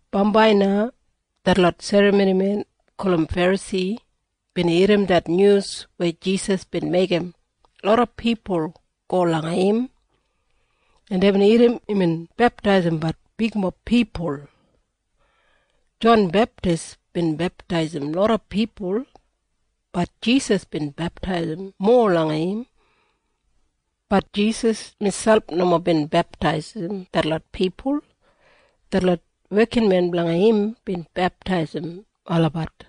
Bambai na detlot serramonimen gulum Ferasi bin irrim det nyus weya Jisas bin meigim loda pipul go langa im, en deibin irrim imbin beptaisimbat bigmob pipul. Jon Beptis bin beptaisim loda pipul. Bat Jisas bin beptaisim mowa langa im. Bat Jisas miselp nomo bin beptaisim detlot pipul. Detlot wekinmen blanga im bin beptaisim olabat.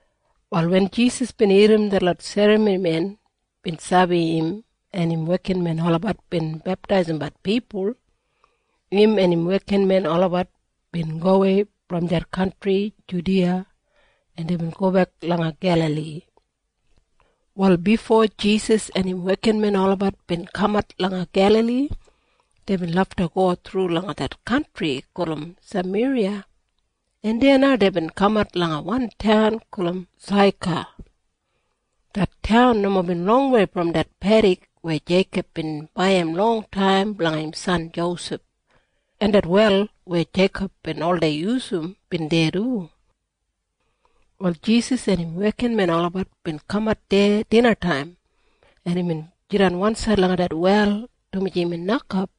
Wal wen Jisas bin irrim detlot serramonimen bin sabi im en im wekinmen olabat bin beptaisimbat pipul, im en im wekinmen olabat bin gowei brom det kantri Judiya, en deibin gobek langa Gelali. Wal bifo Jisas en im wekinmen olabat bin kamat langa Gelali, deibin lafta go thru langa det kantri gulum Sameriya, en deya na deibin kamat langa wan taun gulum Saika. Det taun nomo bin longwei brom det pedik weya Jeikob bin baiyim longtaim blanga im san Josef, en det wel weya Jeikob bin oldei yusum bin deya du. Wal Jisas en im wekinmen olabat bin kamat deya dinataim, en imbin jidan wansaid langa det wel, dumaji imbin nokap,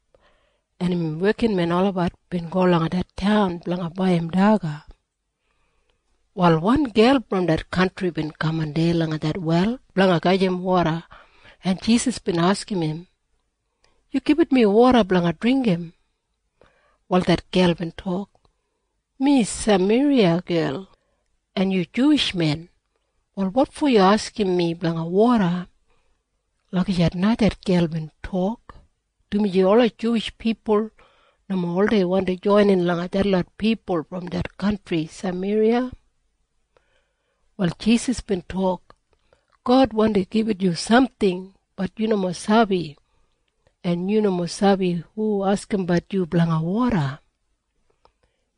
en im wekinmen olabat bin go langa det taun blanga baiyim daga. Wal wan gel brom det kantri bin kaman deya langa det wel blanga gajim woda, en Jisas bin askim im, “Yu gibit mi woda blanga dringgim.” Wal det gel bin tok, “Mi Sameriya gel, en yu Juwish men. Wal wotfo yu askim mi blanga woda?” Lagijat na det gel bin tok, dumaji ola Juwish pipul nomo oldei wandi joinin langa detlot pipul brom det kantri Sameriya. Wal Jisas bin tok, “God wandi gibit yu samting. Bat yu nomo sabi. En yu nomo sabi hu askimbat yu blanga woda.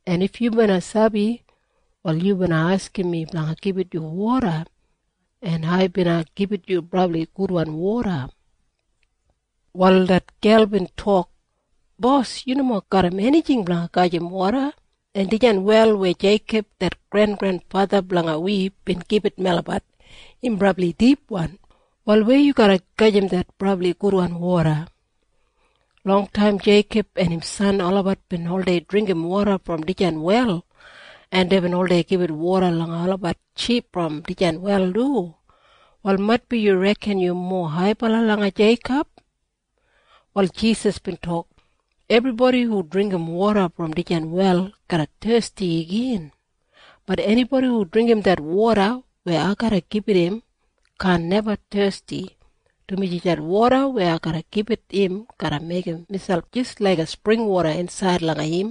En if yu bina sabi, wal yu bina askim mi blanga gibit yu woda, en ai bina gibit yu brabli gudwan woda.” Wal det gel bin tok, “Bos, yu nomo garram enijing blanga gajim woda, en dijan wel weya Jeikob det grengrenfatha blanga wi bin gibit melabat, im brabli dipwan. Wal weya yu garra gajim det brabli gudwan woda? Longtaim Jeikob en im san olabat bin oldei dringgim woda brom dijan wel, en deibin oldei gibit woda langa olabat ship brom dijan wel du. Wal maitbi yu reken yu mowa haibala langa Jeikob?” Wal Jisas bin tok, “Ebribodi hu dringgim woda brom dijan wel garra thesti igin. Bat enibodi hu dringgim det woda weya ai garra gibit im kaan neba thesti, dumaji det woda weya ai garra gibit im garra meigim miselp jis laiga springwoda insaid langa im,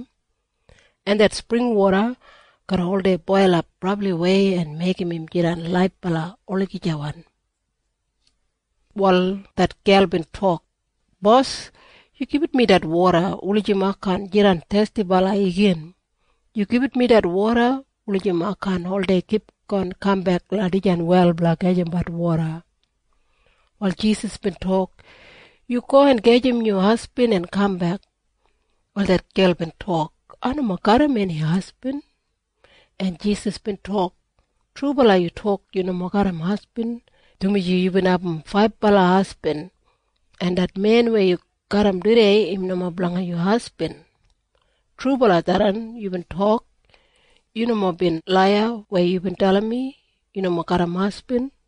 en det springwoda garra oldei boilap brabliwei en meigim im jidan laibala olagijawan.” Wal det gel bin tok, “Bos, yu gibit mi det woda wulijim ai kaan jidan thestibala igin. Yu gibit mi det woda wulijim ai kaan oldei kipgon kambek langa dijan wel blanga gajimbat woda.” Wal Jisas bin tok, “Yu go en gajim yu hasbin en kambek.” Wal det gel bin tok, “Ai nomo garram eni hasbin.” En Jisas bin tok, “Trubala yu tok yu nomo garram hasbin, dumaji yubin abum faibala hasbin. En det men weya yu garram tudei im nomo blanga yu hasbin. Trubala tharran yubin tok. Yu nomo bin laiya weya yubin dalim mi yu nomo garram hasbin.”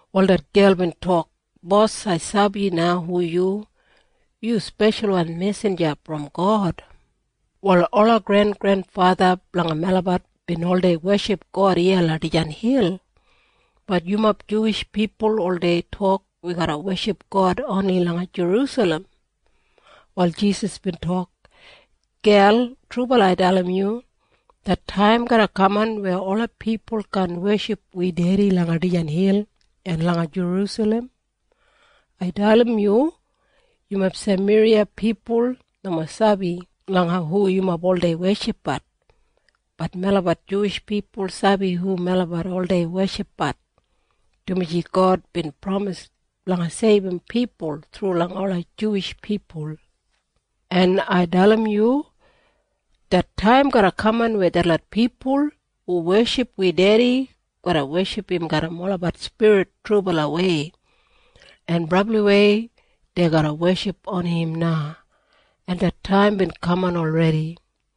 Wal det gel bin tok, “Bos, ai sabi na hu yu. Yu speshalwan mesinja brom God. Wal ola grengrenfatha blanga melabat bin oldei weship God iya langa dijan hil. Bat yumob Juwish pipul oldei tok wi garra weship God oni langa Jerusalem.” Wal Jisas bin tok, “Gel, trubala ai dalim yu. Det taim garra kaman weya ola pipul kaan weship wi Dedi langa dijan hil en langa Jerusalem. Ai dalim yu. Yumob Sameriya pipul nomo sabi langa hu yumob oldei weshipbat. Bat melabat Juwish pipul sabi hu melabat oldei weshipbat, dumaji God bin pramis blanga seibum pipul thru langa ola Juwish pipul. En ai dalim yu. Det taim garra kaman weya detlot pipul hu weship wi Dedi garra weship im garram olabat spirit trubalawei, en brabliwei dei garra weship oni im na. En det taim bin kaman olredi,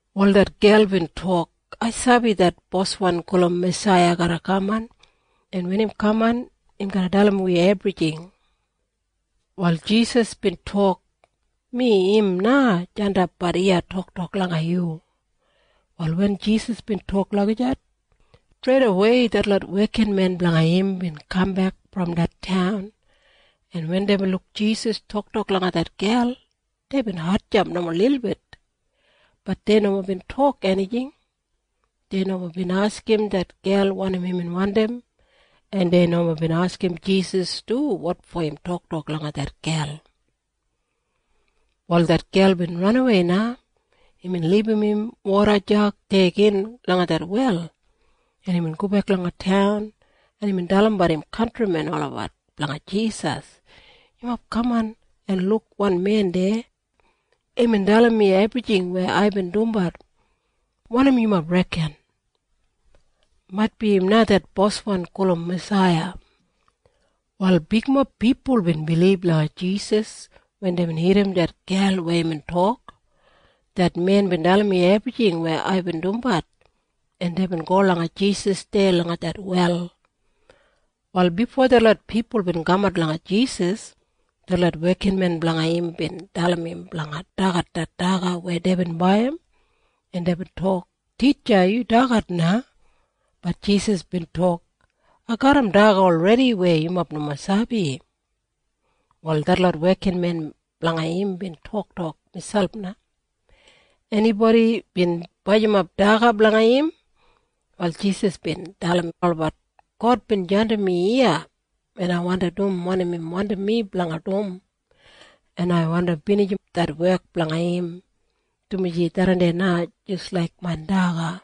Wal det gel bin tok, “Ai sabi det Boswan gulum Masaiya garra kaman, en wen im kaman, im garra dalim wi ebrijing.” Wal Jisas bin tok, “Mi im na jandapbat iya toktok langa yu.” Wal wen Jisas bin tok lagijat, streidawei detlot wekinmen blanga im bin kambek brom det taun, en wen deibin luk Jisas toktok langa det gel, deibin hatjamp nomo lilbit. Bat dei nomo bin tok enijing. Dei nomo bin askim det gel wanim imbin wandim, en dei nomo bin askim Jisas du wotfo im toktok langa det gel. Wal det gel bin ranawei na. Imbin libum im woda jag deya gin langa det wel, en imbin gobek langa taun, en imbin dalimbat im kantrimen olabat blanga Jisas, “Yumob kaman en luk wan men deya. Imbin dalim mi ebrijing weya aibin dumbat. Wanim yumob reken? Maitbi im na det Boswan gulum Masaiya.” Wal bigmob pipul bin bilib langa Jisas wen deibin irrim det gel weya imbin tok, “Det men bin dalim mi ebrijing weya aibin dumbat.” En deibin go langa Jisas deya langa det wel. Wal bifo detlot pipul bin kamat langa Jisas, detlot wekinmen blanga im bin dalim im blanga dagat det daga weya deibin baiyim, en deibin tok, “Titja, yu dagat na.” Bat Jisas bin tok, “Ai garram daga olredi weya yumob nomo sabi.” Wal detlot wekinmen blanga im bin toktok miselp na, “Enibodi bin bajimap daga blanga im?” Wal Jisas bin dalim olabat, “God bin jandim mi iya, en ai wandi dum wanim im wandim mi blanga dum, en ai wandi binijim det wek blanga im, dumaji tharran na jis laik main daga.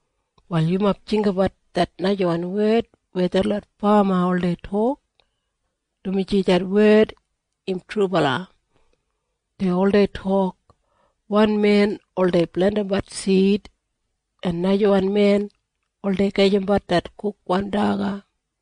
“Wal yumob jinggabat det najawan wed weya detlot fama oldei tok, dumaji det wed im trubala. Dei oldei tok, ‘Wan men oldei plentimbat sid, en najawan men oldei gajimbat det kukwan daga.’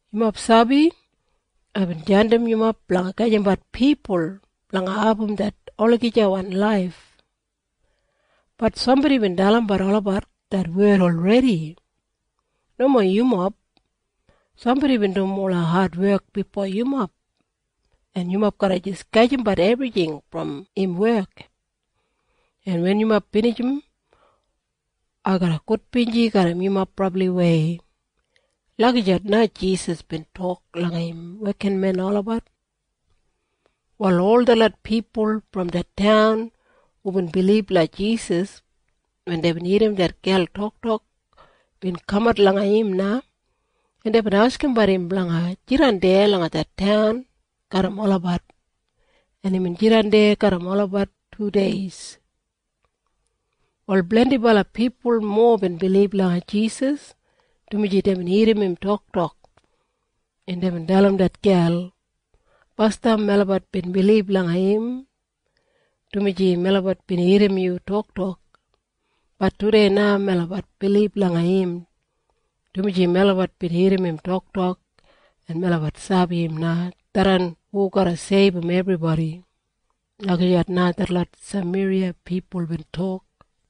“Yumob sabi? Aibin jandim yumob blanga gajimbat pipul blanga abum det olagijawan laif. Bat sambodi bin dalimbat olabat det wed olredi. Nomo yumob. Sambodi bin dum ola adwek bifo yumob, en yumob garra jis gajimbat ebrijing brom im wek. En wen yumob binijim, ai garra gudbinji garram yumob brabliwei.” Lagijat na Jisas bin tok langa im wekinmen olabat. Wal ol detlot pipul brom det taun hubin bilib langa Jisas wen deibin irrim det gel toktok bin kamat langa im na, en deibin askimbat im blanga jidan deya langa det taun garram olabat, en imbin jidan deya garram olabat tudeis. Wal blendibala pipul mowa bin bilib langa Jisas, dumaji deibin irrim im toktok, en deibin dalim det gel, “Basdam melabat bin bilib langa im, dumaji melabat bin irrim yu toktok. Bat tudei na melabat bilib langa im, dumaji melabat bin irrim im toktok, en melabat sabi im na tharran hu garra seibum ebribodi.” Lagijat na detlot Sameriya pipul bin tok.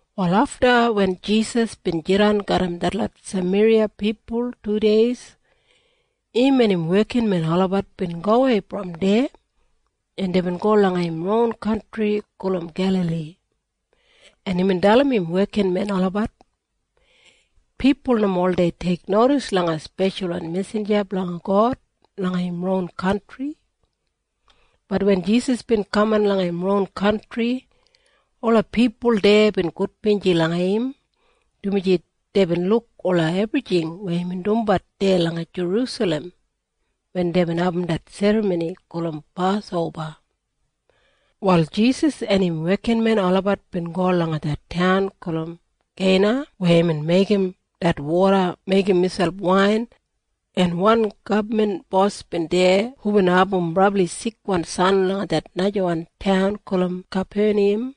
Wal afta wen Jisas bin jidan garram detlot Sameriya pipul tudeis, im en im wekinmen olabat bin gowei brom deya, en deibin go langa im ron kantri gulum Gelali, en imbin dalim im wekinmen olabat, “Pipul nomo oldei teiknodis langa speshalwan mesinja blanga God langa im ron kantri.” Bat wen Jisas bin kamat langa im ron kantri, ola pipul deya bin gudbinji langa im, dumaji deibin luk ola ebrijing weya imbin dumbat deya langa Jerusalem wen deibin abum det serramoni gulum Pasoba. Wal Jisas en im wekinmen olabat bin go langa det taun gulum Keina weya imbin meigim det woda meigim miselp wain, en wan gabman bos bin deya hubin abum brabli sikwan san langa det najawan taun gulum Kapeniyam,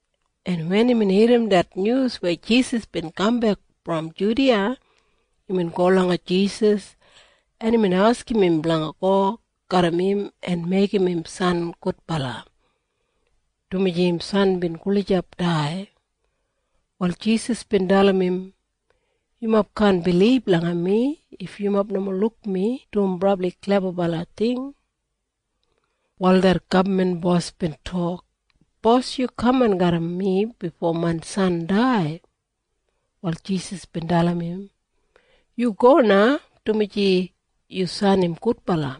en wen imbin irrim det nyus weya Jisas bin kambek brom Judiya, imbin go langa Jisas, en imbin askim im blanga go garram im en meigim im san gudbala, dumaji im san bin gulijap dai. Wal Jisas bin dalim im, “Yumob kaan bilib langa mi if yumob nomo luk mi dum brabli klebabala ting.” Wal det gabman bos bin tok, “Bos, yu kaman garram mi bifo main san dai.” Wal Jisas bin dalim im, “Yu go na, dumaji yu san im gudbala.”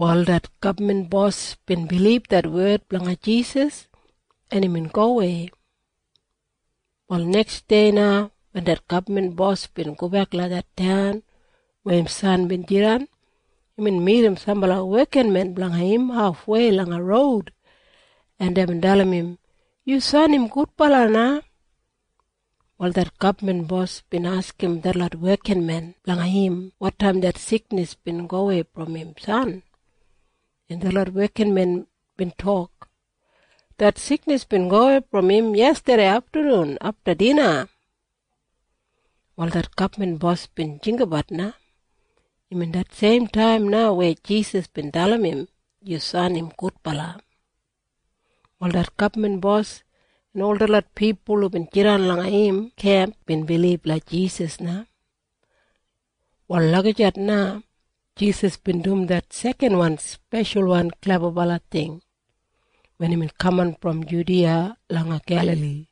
Wal det gabman bos bin bilib det wed blanga Jisas, en imbin gowei. Wal neksdei na wen det gabman bos bin gobek langa det taun weya im san bin jidan, imbin midim sambala wekinmen blanga im hafwei langa roud, en deibin dalim im, “Yu san im gudbala na!” Wal det gabman bos bin askim detlot wekinmen blanga im wotaim det siknis bin gowei brom im san, en detlot wekinmen bin tok, “Det siknis bin gowei brom im yestadei aftanun afta dina.” Wal det gabman bos bin jinggabat na. Imbin det seim taim na weya Jisas bin dalim im, “Yu san im gudbala.” Wal det gabman bos en ol detlot pipul hubin jidan langa im kemp bin bilib langa Jisas na. Wal lagijat na Jisas bin dum det sekanwan speshalwan klebabala ting wen imbin kaman brom Judiya langa Gelali.